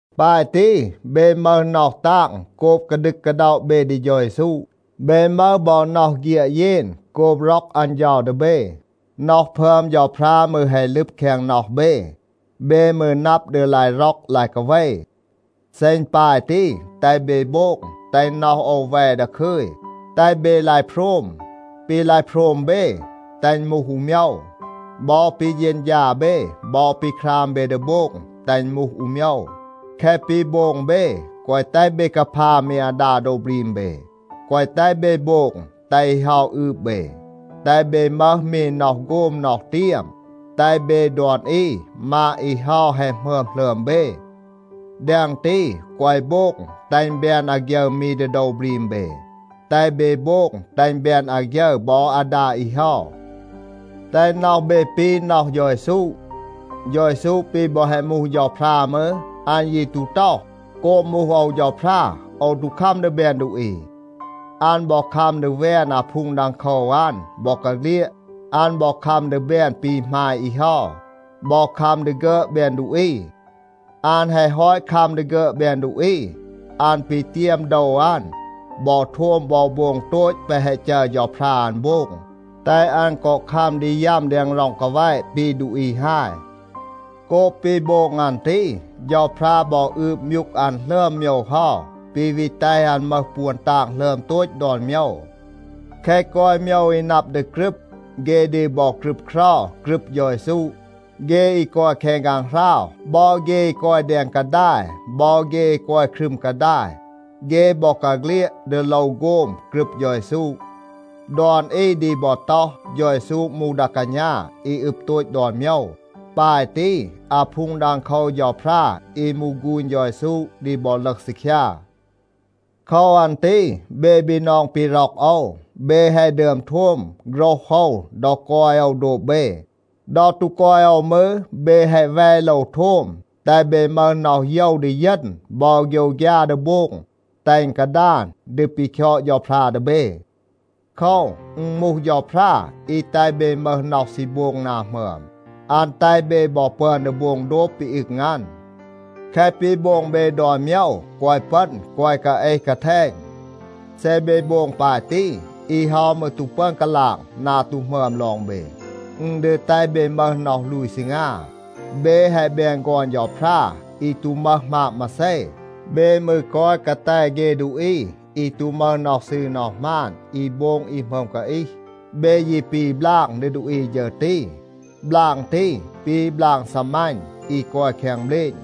ปาย ตี, เบ มึห น็อห ตาง โกบ กาดึก กาด็อะ เบ ดี เฌา เยซู. เบ มึห บอ น็อห เฆียด เยน โกบ ร็อก อัน เฌา ดี เบ. น็อห พึอม เฌาพรา มืร แฮะ ลึบ แคง น็อห เบ. เบ มืร นับ ดี ลาย ร็อก ลาย กาเว. เซ อึณ ปาย ตี, แตห เบ โบง, แตห น็อห โอว แว ดาคึย. แตห เบ ลาย โพรม. ปี ลาย โพรม เบ, แตห อึณ มูห อู โมยว. บอ ปี เฌณฌา เบ บอ ปี คราม เบ ดี โบง, แตห อึณ มูห อู โมยว. แคะ ปี โบง เบ, แกวะ แตห เบ กาพา มี อาดา โดว บรีม เบ. แกวะ แตห เบ โบง, แตห อี เฮา อืบ เบ. แตห เบ มึห มี น็อห โฆม น็อห เตียม, แตห เบ ดอน อี มาด อี เฮา แฮะ หมึอม หลึอม เบ. แดง ตี, แกวะ โบง แตห อึณ แบน อาฆยึร มี ดี โดว บรีม เบ. แตห เบ โบง แตห อึณ แบน อาฆยึร บอ อาดา อี เฮา. แตห น็อห เบ ปี น็อห เฌา เยซู. เฌา เยซู ปี บอ แฮะ มูห เฌาพรา มืร, อัน ยี ตู ต็อห, “โกบ มูห โอว เฌาพรา, โอว ตู คัม ดี แบน ดูอี.” อัน บอ คัม ดี แวน อาพูง ดังโคว อัน บอกาเฆลียด. อัน บอ คัม ดี แบน ปี หมาย อี เฮา, บอ คัม ดี ฆึอด แบน ดูอี. อัน แฮะ ฮอต คัม ดี ฆึอด แบน ดูอี, อัน ปีเตียม โดว อัน บอ โทม บอ โบง โตต แปะ แฮะ จัร เฌาพรา อัน โบง, แตห อัน กอ คัม ดี ยัม แดง ร็อง กาแวะ ปี ดูอี ฮาย. โกบ ปี โบง อัน ตี, เฌาพรา บอ อืบ มยูก อัน หลึอม โมยว เฮา, ปี วี แตห อัน มึห ปวน ตาง หลึอม โตต ดอน โมยว. แคะ กอย โมยว อี นับ ดี กรึบ, เฆ ดี บอ ครึบเครา กรึบ เฌา เยซู. เฆ อี กอย แคง ฆางหราว, บอ เฆ อี กอย แดง กาดาย, บอ เฆ อี กอย ครึม กาดาย, เฆ บอกาเฆลียด ดี โลว โฆม กรึบ เฌา เยซู. ดอน อี ดี บอ ต็อห, เฌา เยซู มูห ดา กาณา อี อึบ โตต ดอน โมยว. ปาย ตี, อาพูง ดังโคว เฌาพรา อี มูห ฆูณ เฌา เยซู ดี บอ ลึห ซีคยา. โคว อัน ตี เบ บีนอง ปี ร็อก โอว, เบ แฮะ ดึอม โทม โฆรห โอว ดอ กอย โอว โดบ เบ. ดอ ตู กอย โอว มืร, เบ แฮะ แว โลว โทม. แตห เบ มึห น็อห โยว ดีเยณ บอ โฆยวฆยา ดี โบง, แตห อึณ กาดาน ดี ปี คยอด เฌาพรา ดี เบ. โคว, อึณ มูห เฌาพรา อี แตห เบ มึห น็อห ซี โบง นา หมึอม. อัน แตห เบ บอ ปึอน ดี โบง โดบ ปี อึง อัน. แคะ ปี โบง เบ ดอน โมยว, แกวะ ปึณ, แกวะ กาเอห กาแทณ. เซ เบ โบง ปาย ตี, อี เฮา มืร ตู ปึอน กาลาง นา ตู หมึอม ลอง เบ. อึณ ดี แตห เบ มึห น็อห ลูย ซีงา. เบ แฮะ แบน ฆอน เฌาพรา อี ตู มึห หมาบ มาเซ. เบ มืร กอย กาแต เฆ ดูอี อี ตู มึห น็อห ซืร น็อห หมาน, อี โบง อี หมึอม กาอีห. เบ ยี ปี บลาง ดี ดูอี ฌึร ตี. บลาง ตี ปี บลาง ซีมัณ อี กอย แคง เบลณ.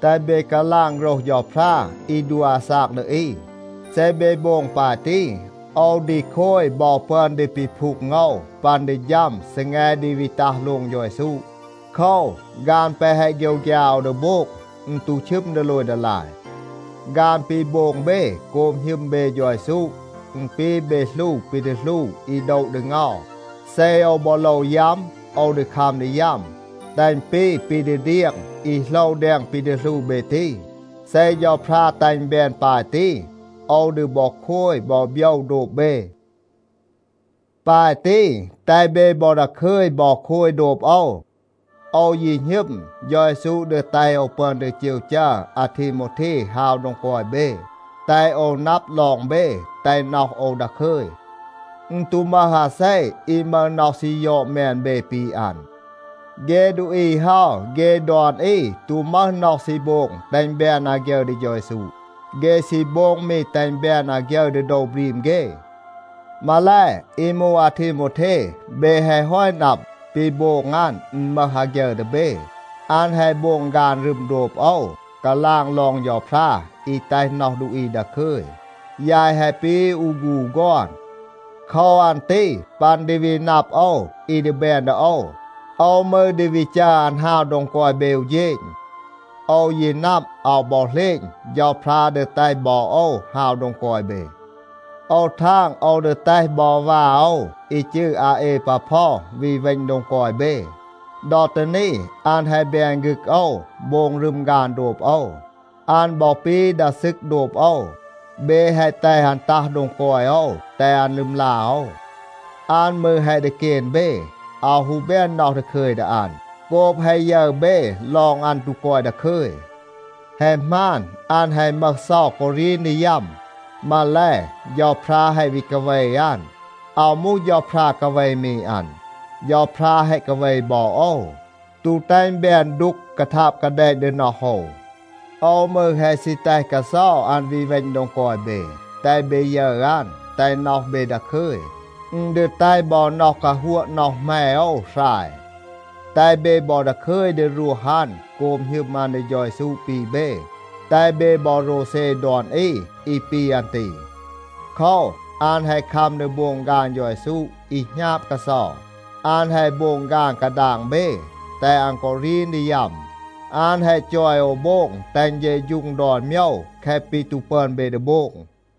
แตห เบ กาลาง โฆรห เฌาพรา อี ดัว อาซาก ดี อี. เซ เบ โบง ปาย ตี, โอว ดี โคย บอ ปึอน ดี ปีพูง โอว ปัน ดี ฌัม ซีแง ดี วี ตัห โลง เฌา เยซู. โคว, ฆาน แปะ แฮะ โฆยวฆยา โอว ดี โบง, อึณ ตู ชึม ดีโลย ดีลาย. ฆาน ปี โบง เบ โกบ หณึม เบ เฌา เยซู, อึณ ปี เบ หลู ปี ดี หลู อี โดะ ดี เงา. เซ โอว บอ โลว ยัม, โอว ดี คัม ดี ยัม, แตห อึณ ปี ปี ดี เดียง อี โหลว แดง ปี ดี หลู เบ ตี. เซ เฌาพรา แตห อึณ แบน ปาย ตี, โอว ดี บอ โคย บอ โบยว โดบ เบ. ปาย ตี, แตห บอ เบ ดาคึย บอ โคย โดบ โอว. โอว ยี หณึม, เฌา เยซู ดี แตห โอว ปึอน ดี เจว จัร อาทีโมวเท ฮาว โดง กอย เบ, แตห โอว นับ ลอง เบ, แตห น็อห โอว ดาคึย. อึณ ตู มึห อาเซ อี มึห น็อห ซี ยอด แมน เบ ปี อัน. เฆ ดูอี เฮา, เฆ ดอน อี ตู มึห น็อห ซี โบง แตห อึณ แบน อาฆยึร ดี เฌา เยซู. เฆ ซี โบง มี แตห อึณ แบน อาฆยึร ดี โดว บรีม เฆ. มาแล, อี มูห อาทีโมวเท, เบ แฮะ ฮอต นับ, ปี โบง อัน อึณ มึห อาฆยึร ดี เบ. อัน แฮะ โบง ฆาน รึม โดบ โอว, กาลาง ลอง เฌาพรา อี แตห น็อห ดูอี ดาคึย. ยาย แฮะ ปี อู ฆูณ อู ฆอน. โคว อัน ตี ปัน ดี วี นับ โอว อี ดี แบน ดี โอว, โอว มืร ดี วี จัร อัน ฮาว โดง กอย เบ อู เฌณ. โอว ยี นับ, อาว บอ เหลณ, เฌาพรา ดี แตห บอ โอว ฮาว โดง กอย เบ. โอว ทาง, โอว ดี แตห บอ วา โอว อี จืร อาเอปาพอ วี เวณ โดง กอย เบ. ดอ ตี นี, อัน แฮะ แบน ฆึก โอว, โบง รึม ฆาน โดบ โอว. อัน บอ ปี ดา ซึก โดบ โอว. เบ แฮะ แตห อัน ตัห โดง กอย โอว, แตห อัน ลึมลา โอว. อัน มืร แฮะ ดีเกน เบ. อาว ฮู แบน น็อห ดาคึย ดี อัน โกบ แฮะ ยึร เบ ลอง อัน ตู กอย ดาคึย. แฮะ หมาน, อัน แฮะ มึห เซา กอ รีน ดี ยัม. มาแล, เฌาพรา แฮะ วี กาเว อัน. อาว มูห เฌาพรา กาเว มี อัน. เฌาพรา แฮะ กาเว บอ โอว, ตู แตห อึณ แบน ดูก กาทาบ กาแดณ ดี น็อห โอว. โอว มืร แฮะ ซี แตห กาเซา อัน วี เวณ โดง กอย เบ, แตห เบ ยึร อัน, แตห น็อห เบ ดาคึย. อึณ ดี แตห บอ น็อห กาฮัวะ น็อห แหม โอว หราย. แตห เบ บอ ดาคึย ดี รวห อัน โกบ หณึม อัน ดี เฌา เยซู ปี เบ. แตห เบ บอ โรวเซ ดอน อี อี ปี อัน ตี. โคว, อัน แฮะ คัม ดี โบง ฆาน เฌา เยซู อี หณาบ กาเซา. อัน แฮะ โบง ฆาน กาดาง เบ, แตห อัน กอ รีน ดี ยัม. อัน แฮะ จอย โอว โบง แตห อึณ เฌะฌูง ดอน โมยว แคะ ปี ตู ปึอน เบ ดี โบง.